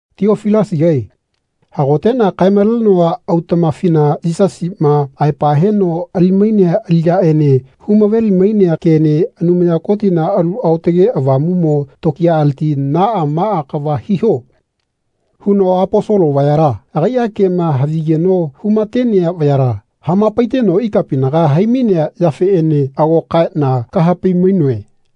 Tiofilasigae hagoteꞌna kaemalenoa autaꞌmafina Yisasiꞌma aepa heno ali-mainea aliꞌyaꞌene humaveli-mainea kene Anumaya Kotina Alu Aotage Avamuꞌmo tokiyaleti “Naꞌa maꞌa kava hiho.” huno Aposolo vayala (agai kema nehavigeno humatenea vayala) hamapaiteno ikapinaga haimainea yafeꞌene ago kaeꞌna kahapai-mainoe.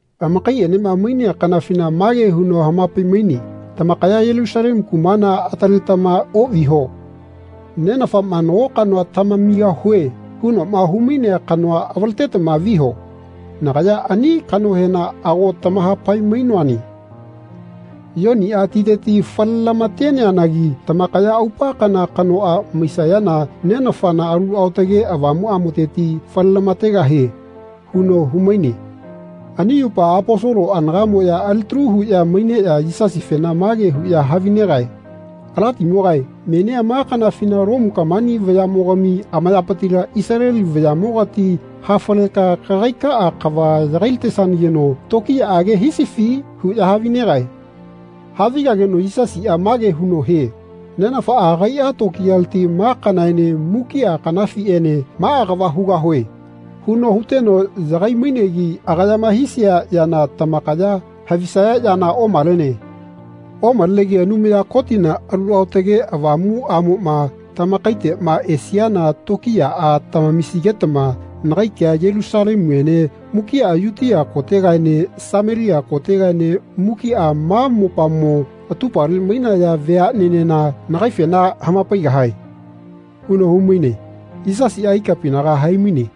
Amakaiꞌenema mainea kanafina mage huno hamapai-maine “Tamakaya Yelusalemu kumala ataletama oꞌviho. Nenafaꞌma ‘Nago kanoa tamamigahue.’ hunoꞌma humainea kanoa avaletetama viho. Nagaya ani kanohena ago tamahapai-mainoane. Yoniꞌa titeti falelamateneanagi tamakaya aupa kana kanoꞌa maisayana Nenafana Alu Aotage Avamuꞌamoteti falelamategahie.” huno humaine. Ani yupa Aposolo anagaꞌmoꞌya alitalu huꞌya maineꞌya Yisasifena mage huꞌya havinegae “Alatimogae menia ma kanafina Lomu kamani vayaꞌmogami amayapitila Isaleli vayaꞌmogati hafaleka kagaikaꞌa kava yagailatesanageno tokiyaꞌage hisifi?” huꞌya havinegae. Havigageno Yisasiꞌa mage huno hie “Nenafaꞌa agaiꞌa tokiyaleti ‘Ma kanaene mukiꞌa kanafiꞌene maꞌa kava hugahue.’ huno huteno yagai-mainegi agayama hisia yana tamakaya havisaya yana omalene. Omalenegi Anumaya Kotina Alu Aotage Avamuꞌamoꞌma tamakaiteꞌma esiana tokiyaꞌa tamamisigetama nagai kea Yelusalemuene mukiꞌa Yutia kotegaene Samelia kotegaene mukiꞌa ma mopamo atupale mainaya veaꞌnenena nagaifena hamapaigahae.” huno humaine. Yisasiꞌa ikapinaga haimaine.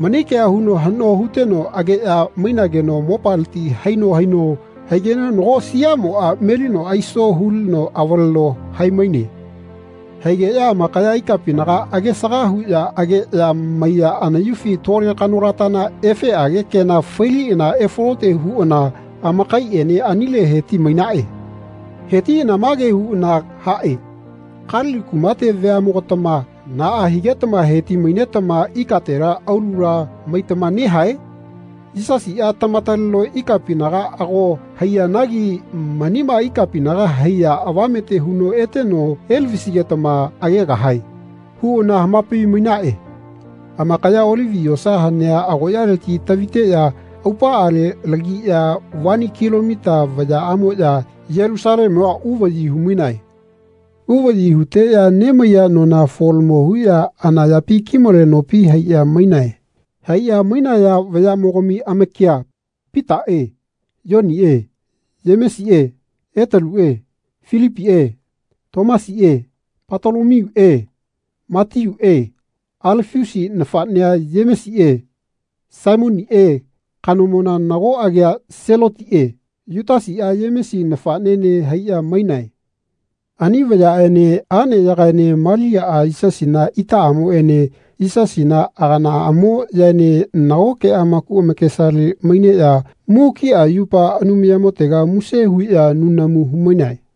Mani kea huno haꞌno huteno ageꞌya mainageno mopaleti haino haino haigeno nako siaꞌmoꞌa melino aiso hulino avaleno haimaine. Haigeꞌya amakaya ikapinaga agesaga huꞌya ageꞌya maiya anayufi tole kanolatana efeꞌage kena failiꞌana efalote huꞌana amakaiꞌene anile heti-mainaꞌe. Hetiꞌana mage huꞌana haꞌe “Kalili kumate veaꞌmogatama naꞌa higetama heti-mainetama ikatela aulula maitama nehae? Yisasiꞌa tamataleno ikapinaga ago haiyanagi manima ikapinaga haiya avamete huno eteno elavisigetama agegahae.” huꞌana hamapai-mainaꞌe. Amakaya Olivi yosa hanea agoꞌyaleti taviteꞌya aupaꞌale lagiꞌya vani kilomita vayaꞌamoꞌya Yelusalemua uvaꞌyi humainae. Uvaꞌyi huteꞌya nemaiya nona folamo huꞌya ana yapi kimale nopi haiꞌya mainae. Haiꞌya mainaya vayaꞌmogami amakia Pitaꞌe Yoniꞌe Yemesiꞌe Etaluꞌe Filipiꞌe Tomasiꞌe Patolomiuꞌe Matiuꞌe Alafiusi nafaꞌnea Yemesiꞌe Saimoniꞌe kanomona nako agia Selotiꞌe Yutasiꞌa Yemesi nafaꞌnene haiꞌya mainae. Ani vayaꞌene aꞌneyagaene Maliaꞌa Yisasina itaꞌamoꞌene Yisasina aganaꞌamoꞌyaene nagoke amaku amakesale maineꞌya mukiꞌa yupa Anumayamotega muse huꞌya nunamu humainae.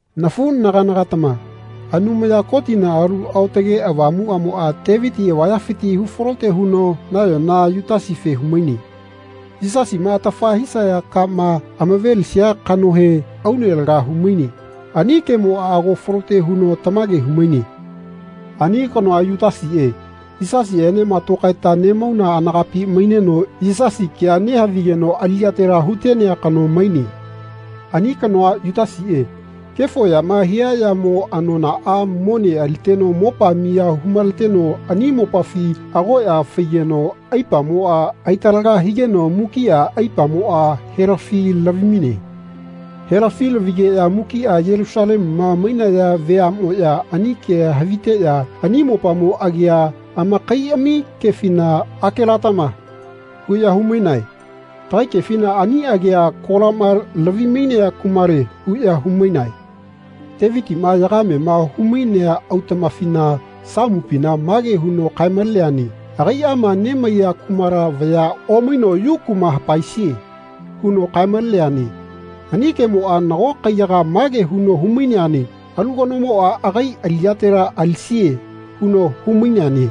“Nafuꞌnaganagatama Anumaya Kotina Alu Aotage Avamuꞌamoꞌa Teviti avayafiti hufalote huno nayona Yutasife humaine. Yisasima atafa hisaya kama amavelisia kanohe, aune laga humaine. Ani kemoꞌa ago falote huno tamage humaine. Ani kanoa, Yutasiꞌe, Yisasiꞌenema tokaeta nemauna anagapi maineno Yisasi kea nehavigeno aliꞌyatela hutenea kano maine. Ani kanoa, Yutasiꞌe, kefo yama hia yamo anonaꞌa mone aliteno mopa miya humaleteno ani mopafi agoꞌya faigeno aipamoꞌa aitalaga higeno mukiꞌa aipamoꞌa helafi lavi-maine. Helafi lavigeꞌya mukiꞌa Yelusalemuma mainaya veaꞌmoꞌya ani kea haviteꞌya ani mopamo agia amakaiꞌami kefina ‘Akelatama.’ huꞌya humainae. Tagai kefina ani agia ‘Kolama lavi-mainea kumale.’ huꞌya humainae. Tevitiꞌma yagamema humainea autaꞌmafina, Samupina, mage huno kae-maleneane ‘Agaiꞌama nemaiya kumala vaya omaino yu kuma hapaesie.’ huno kae-maleneane. Ani kemoꞌa nago kaiyaga mage huno humaineane ‘Alu kanomoꞌa agai aliꞌyatela alisie.’ huno humaineane.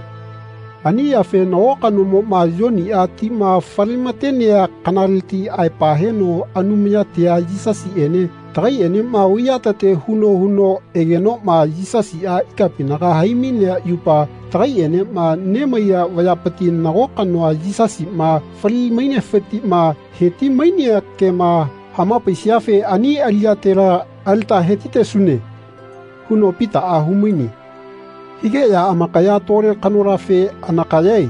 Ani yafe nago kanomoꞌma Yoniꞌa tima falematenea kanaleti aepa heno Anumayatia Yisasiꞌene tagaiꞌenema vaiyatete huno huno egenoꞌma Yisasiꞌa ikapinaga haimainea yupa tagaiꞌenema nemaiya vayapiti nago kanoa Yisasiꞌma fali-mainefitiꞌma heti-mainea kema hamapaisiafe ani aliꞌyatela alita hetitesune.” huno Pitaꞌa humaine. Higeꞌya amakaya tole kanolafe “Anakayae.”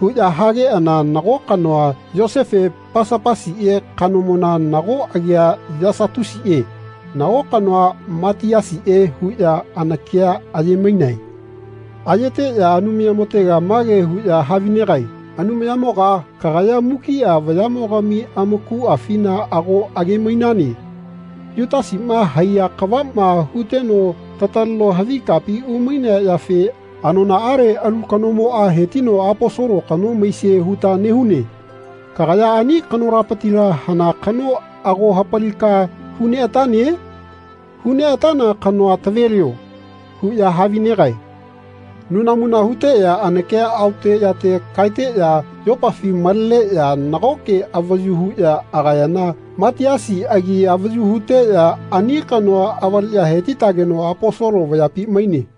huꞌya hageꞌana nago kanoa, Yosefe Pasapasiꞌe kanomona, nago agia Yasatusiꞌe, nago kanoa Matiasiꞌe huꞌya anakia ayemainae. Ayeteꞌya Anumayamotega mage huꞌya havinegae “Anumayamoga kagaya mukiꞌa vayaꞌmogami amakuꞌafina ago age-mainane. Yutasiꞌma haiya kavaꞌma huteno tataleno havi kapi umainea yafe anonaꞌale alu kanomoꞌa hetino Aposolo kano maisie huta nehune. Kagaya ani kanolatapitila hana kano ago hapalika huneꞌatane? Huneꞌatana kanoa tavelio.” huꞌya havinegae. Nunamuna huteꞌya anakia aote yate kaeteꞌya yopafi maleneꞌya nagoke avayu huꞌya agayana Matiasi agi avayu huteꞌya ani kanoa avaleꞌya hetitageno Aposolo vayapi maine.